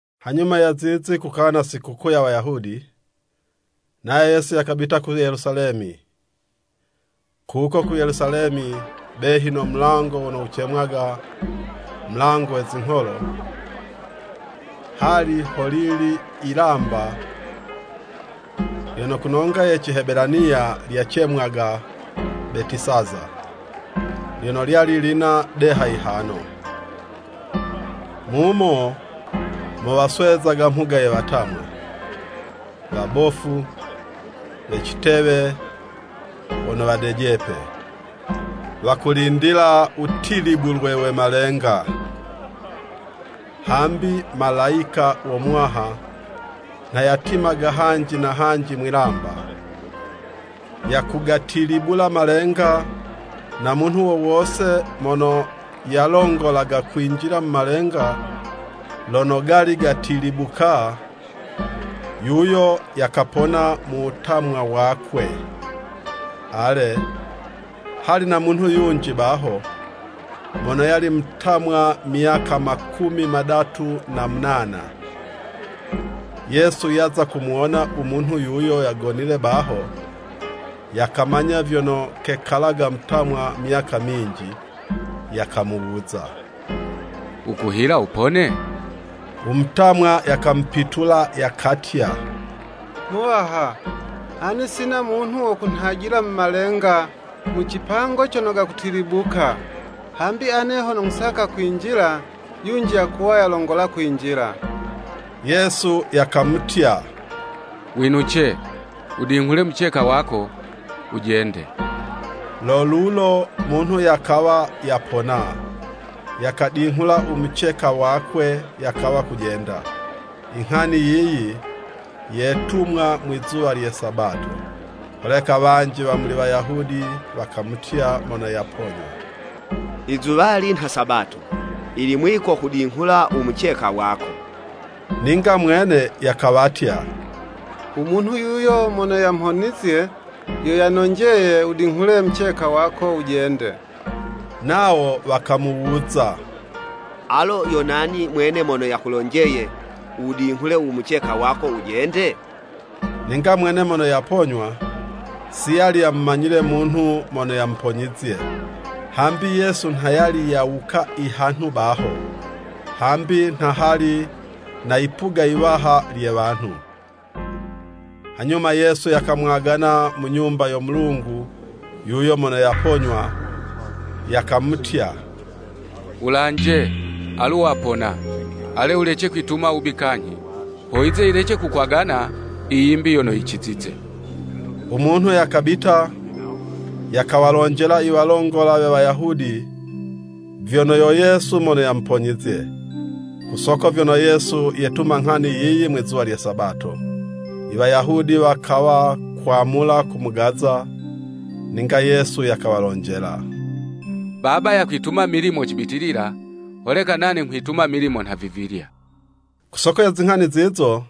Hanyuma ya zizi kukawa na sikukuu ya Wayahudi, nayo Yesu yakabita ku Yelusalemi. Kuko ku Yelusalemi, behi no mulango wono wucemwaga, “Mulango we Zingholo.” Hali ho lili yilamba, lyono ku nonga ye Cihebelaniya lyacemwaga “Betisaza.” Lyono lyali lina deha yihano. Mumo mo waswezaga mhuga ye watamwa, wabofu, we citewe, wono wadejepe. [Wakulindila wutilibulwe we malenga, hambi Malayika wo Muwaha, nha yatimaga hanji na hanji mwilamba, yakugatilibula malenga, no munhu wo wose mono yalongolaga kwinjila mu malenga lono gali gatilibuka, yuyo yakapona mu wutamwa wakwe.] Ale, hali na munhu yunji baho, mono yali mutamwa myaka makumi madatu na munana. Yesu yaza kumuwona u munhu yuyo yagonile baho, yakamanya vyono kekalaga mutamwa myaka minji, yakamuwuza, “Wukuhila Wupone?” U mutamwa yakamupitula yakatya, “Muwaha, ane sina munhu wo kunhajila mu malenga, mu cipango cono gakutilibuka. Hambi ane hono nghusaka kwinjila, yunji yakuwa yalongola kwinjila.” Yesu yakamutya, “Winuce, wudinghule muceka wako, wujende.” Lo lulo munhu yakawa yapona, yakadinghula u muceka wakwe yakawa kujenda. I nghani yiyi, yetumwa mwizuwa lye Sabato. Holeka wanji wa muli Wayahudi wakamutya mono yaponywa, “Izuwali nha Sabato, yili mwiko kudinghula u muceka wako.” Ninga mwene yakawatya, “U munhu yuyo mono yamhonizye, yo yanonjeye, wudinghule muceka wako wujende.” Nawo wakamuwuza, “Alo yo nani mwene mono yakulonjeye, wudinghule u muceka wako wujende?” Ninga mwene mono yaponywa, si yali yamumanyile munhu mono yamuponyizye, hambi Yesu nha yali yawuka ihanhu baho, hambi nha hali na yipuga yiwaha lye wanhu. Hanyuma Yesu yakamwagana mu Nyumba yo Mulungu yuyo mono yaponywa, yakamutya, “Wulanje, alu wapona, ale wulece kwituma wubi kanyhi, ho yize yilece kukwagana i yimbi yono yicizize.” U munhu yakabita, yakawalonjela iwalongola we Wayahudi vyono yo Yesu mono yamuponyizye. Ku soko vyono Yesu yetuma nghani yiyi mwizuwa lye Sabato, Iwayahudi wakawa kwamula kumugaza. Ninga Yesu yakawalonjela, “Baba yakwituma milimo cibitilila, holeka nane nghwituma milimo nhavivilya.” Ku soko ye zinghani zizo,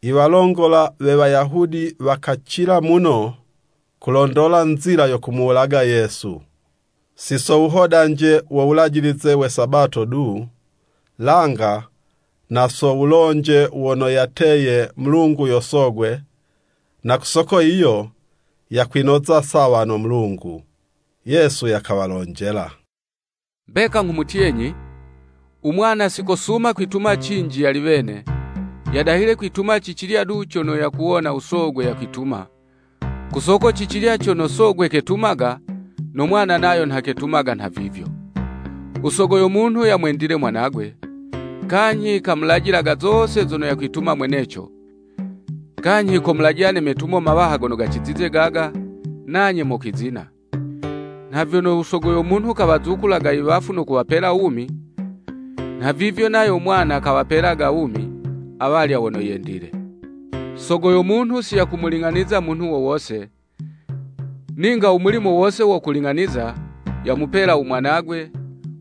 iwalongola we Wayahudi wakacila muno kulondola nzila yo kumuwulaga Yesu, si so wuhodanje wo wulajilize we Sabato du, langa na so wulonje wono yateye Mulungu yo Sogwe, na ku soko yiyo yakwinoza sawa no Mulungu. Yesu yakawalonjela, “Mbeka nghumutyenyi, u Mwana si kosuma kwituma cinji yali wene, yadahile kwituma cicilya du cono yakuwona u Sogwe yakwituma, ku soko cicilya cono sogwe ketumaga, no mwana nayo vyo ketumaga nhavivyo. U Sogo yo munhu yamwendile Mwanagwe, kanyhi kamulajilaga zose zono yakwituma mweneco, kanyhi komulajila ne metumo mawaha gono gacizize gaga, nanye mokwizina. Nha vyono u Sogo yo munhu kawazukulaga i wafu no kuwapela wumi, nhavivyo nayo Mwana kawapelaga wumi awalya wono yendile. Sogo yo munhu si yakumuling'aniza munhu wo wose, ninga u mulimo wose wo kuling'aniza, yamupela u Mwanagwe,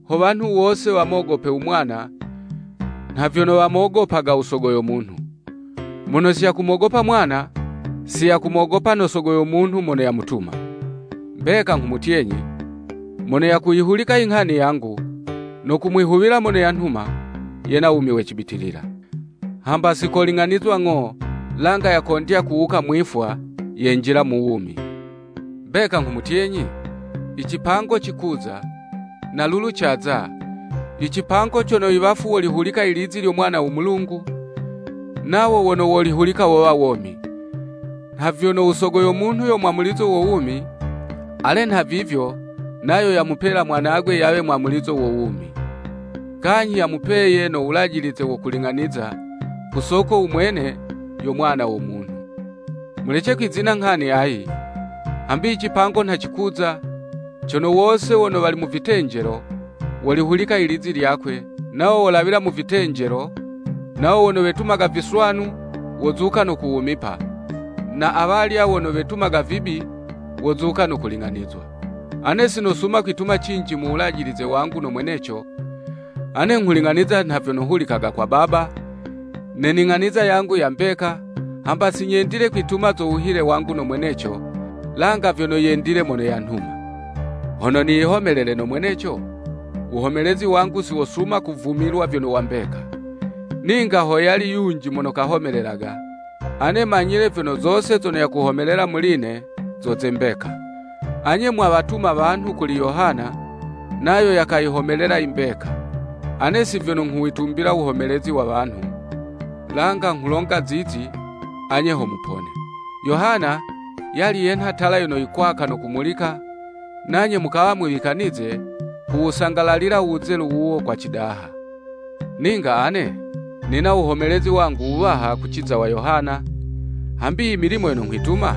ho wanhu wose wamogope u Mwana, nha vyono wamogopaga u Sogo yo munhu. Mono siyakumogopa Mwana, si yakumogopa no Sogo yo munhu mono yamutuma. “Mbeka nghumutyenyi, Mono yakuyihulika i nghani yangu, no kumwihuwila mono yanhuma, yena wumi we cibitilila. Hamba si koling'anizwa ng'o, langa yakondya kuwuka mwifwa, yenjila mu wumi. Mbeka nghumutyenyi, i cipango cikuza, na lulu caza, i cipango cono i wafu wolihulika ilizi lyo Mwana wo Mulungu, nawo wono wolihulika wowa womi. Nha vyono u Sogo yo munhu yo mwamulizo wo wumi, ale nhavivyo nayo yamupela Mwanagwe yawe mwamulizo wo wumi. Kanyhi yamupeye no wulajilize wo kuling'aniza, ku soko u mwene, yo Mwana wo Munhu. Mulece kwizina nghani ayi, hambi i cipango nha cikuza, cono wose wono wali mu vitenjelo, wolihulika ilizi lyakwe, nawo wolawila, mu vitenjelo, nawo wono wetumaga viswanu, wozuka no kuwumipa, na awalya wono wetumaga wubi, wozuka no kuling'anizwa. “Ane si nosuma kwitumila cinji mu wulajilize wangu no mweneco, ane nghuling'aniza nha vyono hulikaga kwa Baba, ne ning'aniza yangu ya mbeka, hamba si nyendile kwituma zo wuhile wangu no mweneco, langa vyono yendile mono yanhuma. Hono niyihomelele no mweneco, wuhomelezi wangu si wosuma kuvumilwa vyono wa mbeka. Ninga ho yali yunji mono kahomelelaga, ane manyile vyono, zose zono yakuhomelela muli'ne zo ze mbeka. Anye mwawatuma wanhu kuli Yohana, nayo yakayihomelela yi mbeka. Ane si vyono nghuwitumbila wuhomelezi wa wanhu, langa nghulonga zizi, anye ho mupone. Yohana yali yenha tala yono yikwaka no kumulika, nanye mukawa mwiwikanize kuwusangalalila u wuzelu wuwo kwa cidaha. Ninga ane nina wuhomelezi wangu wuwaha kuciza wa Yohana, hambi i milimo yono nghwituma,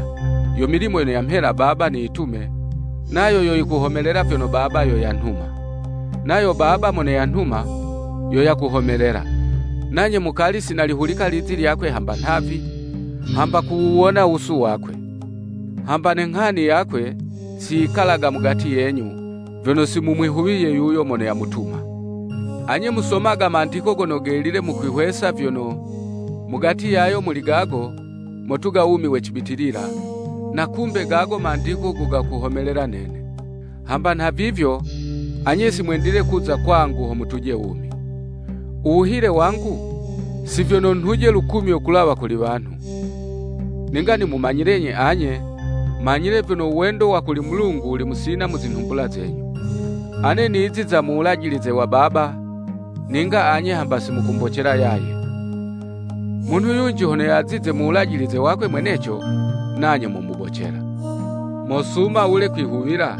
yo milimo yono yamhela Baba niyitume, nayo yo yikuhomelela vyono Baba yo yanhuma. Nayo Baba mono yanhuma, yo yakuhomelela. Nanye mukali si nalihulika lizi lyakwe hamba nhavi, hamba kuwuwona wusu wakwe. Hamba ne Nghani yakwe, si yikalaga mugati yenyu, vyono si mumwihuwiye yuyo mono yamutuma. Anye musomaga Mandiko Gono Gelile mukwihwesa vyono, mugati yayo muli gago, motuga wumi we cibitilila, na kumbe gago Mandiko go gakuhomelela nene! Hamba nhavivyo, anye si mwendile kuza kwangu ho mutuje wumi. “U wuhile wangu, si vyono ho nhuje u lukumyo kulawa kuli wanhu. Ninga nimumanyilenyi anye, manyile vyono u wendo wa kuli Mulungu wuli musina mu zinhumbula zenyu. Ane niziza mu wulajilize wa Baba, ninga anye hamba si mukumbocela yaye, munhu yunji hono yazize mu wulajilize wakwe mweneco, nanye momubocela. Mosuma wule kwihuwila,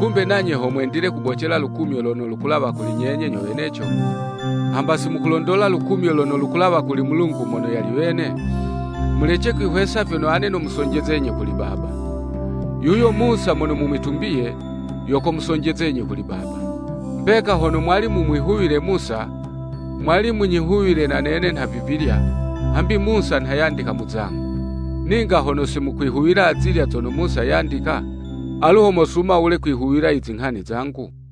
kumbe nanye ho mwendile kubocela lukumyo lono lukulawa muli nyenye nyo weneco, hamba si mukulondola lukumyo lono lukulawa kuli Mulungu mono yali wene? Mulece kwihwesa vyono ane nomusonjezenyi kuli Baba. Yuyo Musa mono mumwitumbiye, yo komusonjezenyi kuli Baba. Mbeka hono mwali mumwihuwile Musa, mwali munyihuwile na nene nhavivilya, hambi Musa nha yandika mu zangu. Ninga hono si mukwihuwila azilya zono Musa yandika, alu mosuma wule kwihuwila i zinghani zangu?”